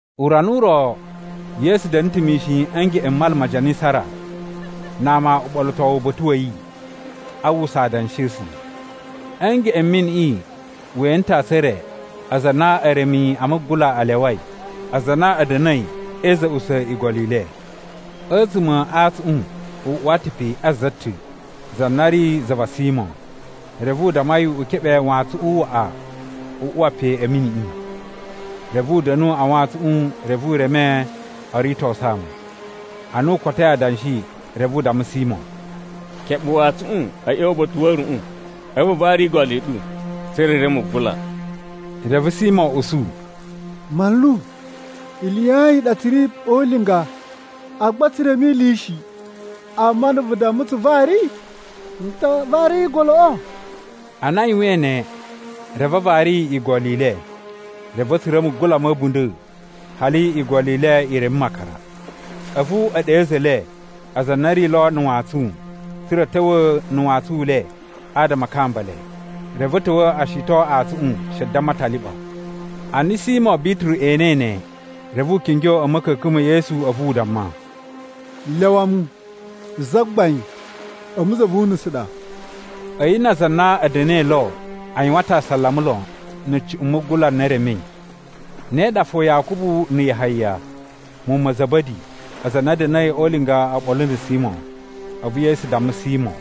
Urana u ro, Yesu da̱na̱ ta̱ mishin a̱ ngeꞌen m Mala ma Janisara, na ama uɓolotowu uba̱ta̱ wa̱ yi, a uwwusa adanshi a̱ A̱sula̱. A̱ ngeꞌen m miniꞌi we ene ta̱ antsun e re, aza a na eremi a mugula a lyawai. Aza a na a̱ da̱na̱i e iza̱ꞌusa̱ igolo i le. A̱tsuma̱ a antsuꞌun u uwa ta̱ pe a za ta̱ za na ri za va Simo, reve u damma yi u keɓe wantsuꞌun waꞌa a uwa pe a̱ miniꞌi. Reve u da̱nu a wantsuꞌun, reve u reme o ritosu ama. Ana u kotoi adanshi, reve u damma Simo, “Keɓe wantsuꞌun a̱ ꞌya̱wa̱ uba̱ta̱ wa̱ a̱ruꞌun, a̱vu vu vari igolo i ɗu, tsa̱ra̱ i reme mugula.” Reve Simo usu, “Manlu, ili ya ayin i ɗa tsu ri o ulinga, agba tsu reme ili shi, amma ana vu dammai tsu vari, n ta vari igoloꞌo.” Ana a yuwain ne, reve a vari igolo i le, reve a̱ tsura̱ mugula ma̱ a̱bunda̱, hali igolo i le i reme makara. A̱vu e ɗe a̱za̱ e le, aza a na a̱ ri lo na̱ wantsun, tsa̱ra̱ a̱ ta̱wa̱ na̱ wantsun u le, adama a kamba le. Reve a̱ ta̱wa̱ o shiton antsuꞌun, she damma a ta liɓa. Ana Simo Bituru enei ne, reve u kingyo a̱ ma̱ka̱ka̱n ma̱ Yesu a̱vu u damma, “Lyawa mu, Zagbain, a̱mu za vu unusu ɗa.” A̱yi na aza a na a̱ da̱na̱i lo, a yuwan ta̱ asalama lon na̱ cuꞌun mugula n na e remei. Ne ɗa fo Yakubu na̱ Yahaya, muwun ma̱ Za̱ba̱di, aza a na a̱ da̱na̱i o ulinga oɓolo na̱ Simo. A̱vu Yesu damma Simo,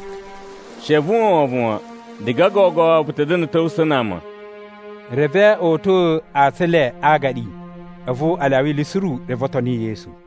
“She vu uwwa wovon wan, diga gogo vu ta̱ da̱na̱ a̱ ta̱wusa̱ na ama.” Reve o uta̱a̱ antsun e le a agaɗi, a̱vu a lyawa ili suru, reve o toni Yesu.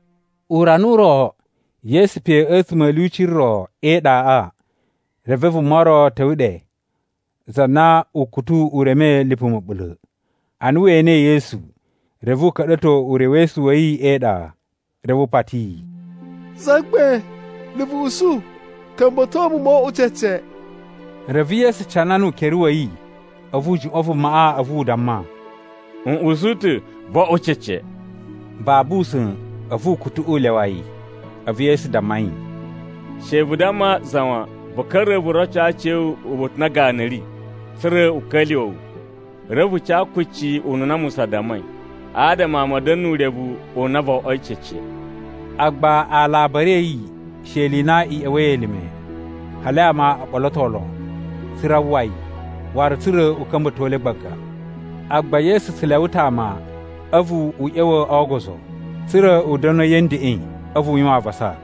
Urana u ro, Yesu pe a̱tsuma̱ a̱ lyuci ro e iɗaꞌa, reve vuma ro ta̱wa̱ ɗe, za na ukutu u remei lipu ma̱ɓula̱. Ana we enei Yesu, reve u ka̱ɗa̱to urewesu wa̱ yi e iɗa, reve u pati yi, “Zagbain, na̱ vu usu, ka̱mba̱to mu mo oꞌwo cece.” Reve Yesu canana ukere wa̱ yi, a̱vu u juꞌwa̱n vumaꞌa, a̱vu u damma, “N usu ta̱, vo oꞌwo cece!” Babu usa̱n, a̱vu ukutuꞌu u lyawa yi. A̱vu Yesu damma yi, “She vu damma za wan, vu ka̱ra̱ vu roco aciya̱wu uba̱ta̱ u na ganu ri, tsa̱ra̱ u ka̱lyuwa̱ wu. Reve vu ca kucci ununa Musa dammai, adama ama a̱ da̱na̱ nu urevu u na vo oꞌwoi cece.” Agba alabari a̱ yi she ili i na i ꞌya̱wa̱i elime, hali ama o ɓoloto lon, tsa̱ra̱ a uwwa yi, waru tsa̱ra̱ u ka̱mba̱to le gbaga. Agba Yesu tsu lyawa ta̱ ama a̱vu u ꞌya̱wa̱ o ogozo, tsa̱ra̱ u da̱nu a̱yi a̱ ndeꞌen, a̱vu u yuwan avasa.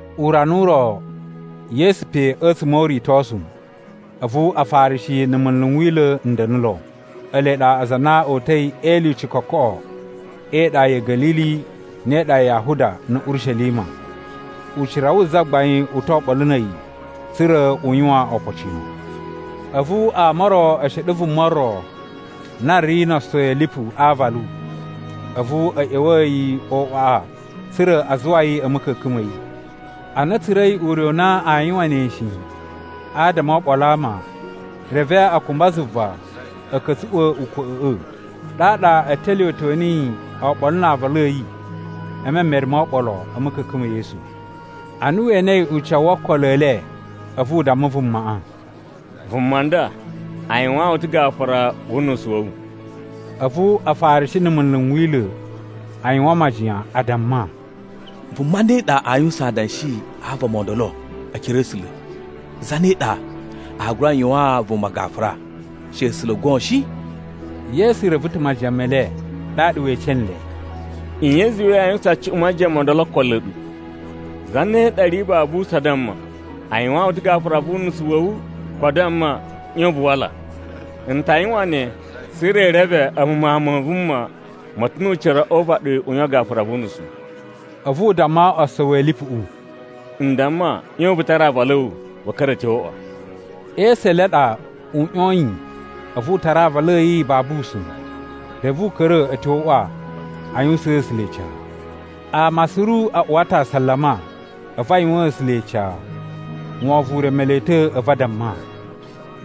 Urana u ro, Yesu pe a̱tsuma̱ o uritosu, a̱vu Afarishi na̱ munlu n Wila̱ n da̱na̱ lo. Ele ɗa aza a na o uta̱i e ilyuci kokoꞌo e iɗa ya̱ Ga̱lili ne e iɗa ya Yahuda na̱ Urishelima. Ucira wu Zagbain u to oɓolo na̱ a̱yi, tsa̱ra̱ u yuwan opocino. A̱vu ama o ro e sheɗe vuma ro na ri no osowi a̱ lipu a aavalu, a̱vu a̱ ꞌya̱wa̱a̱ yi o uꞌwaꞌa, tsa̱ra̱ a zuwa yi a̱ ma̱ka̱ka̱n ma̱ yi. Ana a̱ tsura̱i ure u na aa yuwan ne shi adama o oɓolo a ama, reve a kumba zuva a̱ ka̱tsuꞌwa̱ ukwa̱ꞌa̱ꞌa̱. Ɗaɗa e telyuwetyo niyi oɓolo na aavalu a̱ yi e memere mo oɓolo a̱ ma̱ka̱ka̱n ma̱ Yesu. Ana we enei ucawu wo okolo e le, a̱vu u damma vumaꞌa, “Vuma nda, a yuwaan wu ta̱ gafura wu unusu wa̱ wu.” A̱vu Afarishi na̱ munlu n Wila̱ a yuwan majiyan, a damma, “Vuma ne ɗa aa yuwusan adanshi a vama o ndolo e ekere a̱ A̱sula̱? Zane ɗa aa gura yuwaan vuma gafura, she A̱sula̱ goon shi?” Yesu reve ta̱ majiyan me le, ɗaɗa we ece nle, “Nye i zuwai yaa yuwusan cuꞌun majiyan mo ndolo o okolo a̱ ɗu? Zane ɗa ri babu usa̱n a damma, ‘A yuwaan wu ta̱ gafura wu unusu wa̱ wu,’ ko a damma, ‘ꞌYon vu wala?’ N ta yuwan ne, tsa̱ra̱ i reve a̱mu Mawun ma Vuma ma̱ ta̱ nu ucira o uvaɗi u yuwan gafura vu unusu.” A̱vu u damma osowi a̱ lipuꞌu, “N damma, ꞌyon vu tara aavalu a̱ wu, vu ka̱ra̱ a̱ tyo o uꞌwa.” E esu e le a ɗa u ꞌyoyin a̱vu u tara aavalu a̱ yi babu usa̱n, reve u ka̱ra̱ a̱ tyo o uꞌwa a yuwusaan A̱sula̱ ica. Ama suru a uwa ta̱ asalama, a̱vu a yuwaan A̱sula̱ ica. Wovon u reme le ta̱, a̱vu a damma,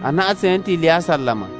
“Anaꞌan tse ene ta̱ ili ya asalama.”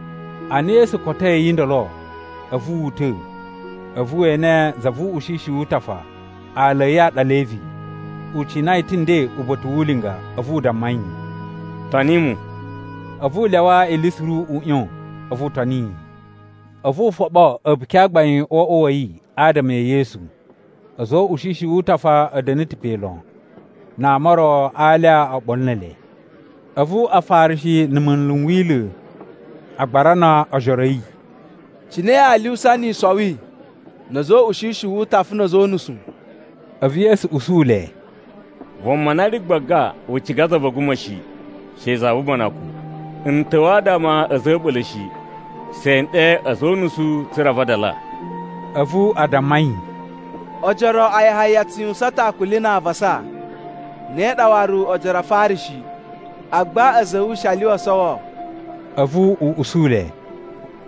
Ana Yesu kotoi a̱yi ndolo, a̱vu wu uta̱, a̱vu we ene za vu uꞌushishi wu utafa. Aala a̱ yi a ɗa Levi. U cina yi ta̱ nden uba̱ta̱ wu ulinga. A̱vu u damma yi, “Toni mu.” A̱vu u lyawa ili suru u ꞌyon, a̱vu u toni yi. A̱vu u foɓo a̱buki a gbain o uꞌwa wa̱ yi adama e Yesu. A̱za̱ o uꞌushishi wu utafa a̱ da̱na̱ ta̱ pe lon, na ama o ro a alya oɓolo ne ele. A̱vu Afarishi na̱ munlu n Wila̱, a gbarana ojoro a̱ yi, “Cine yaa lyuwusa ni i sowi na̱ a̱za̱ o uꞌushishi wu utafa na̱ a̱za̱ o unusu?” A̱vu Yesu usu le, “Vuma na ri gbaga u ciga za va̱ a̱guma̱ shi, she za vu ubanakun. N ta̱wa̱ adama a̱ a̱za̱ a̱ a̱ɓula̱ shi, she n ɗe a̱za̱ o unusu tsa̱ra̱ a vadala.” A̱vu a damma yi, “Ojoro a Yahaya a tsu yuwusan ta̱ akuli na avasa, ne ɗa waru ojoro a Afarishi, agba a̱za̱ a̱ wu she a lyuwa o sowo.” A̱vu u usu le,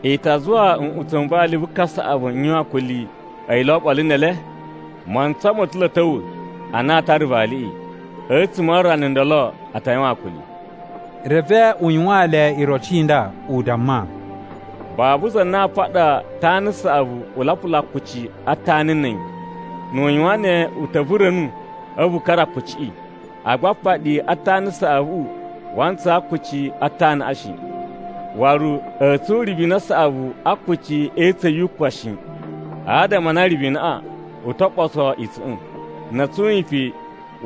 “I ta zuwa nꞌutsa̱ n vali vu kasaꞌavu n yuwan akuli, a̱yi lo oɓolo ne ele? Mantsa ma̱ ta̱ lo a̱ ta̱wa̱ ana aa tara le valiꞌi, a̱tsuma̱ a rana ndolo a ta yuwan akuli.” Reve u yuwaan le iroci i nda, u damma: “Babu za na a paɗa tana saꞌavu u lapula akuci a tana na̱ a̱yi. Nu u yuwan ne, u ta̱ vura̱nu a̱vu u kara akuciꞌi, agba apaɗi a tana saꞌavuꞌu wa ntsaa akuci a tanaꞌa shi. Waru, a̱a̱ tsun ribina saꞌavu a akuci e itsa̱n yu kwan shi, adama a na ribinaꞌa u to ɓoso itsa̱ꞌa̱n. Na̱ a̱ tsun yi pe,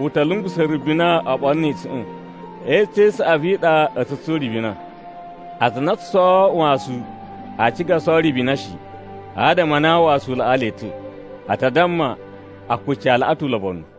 u ta̱ lungusa̱ ribina oɓolo ni itsa̱ꞌa̱n. E itsa̱n i saꞌavu i ɗa a̱ tsu tsun ribina. Aza a na o tsu sowo wasu aa ciga o sowo ribina shi, adama a na wasu u laꞌaa le ta̱. A ta damma, ‘Akuci a laꞌa ta̱ ulobonu.’”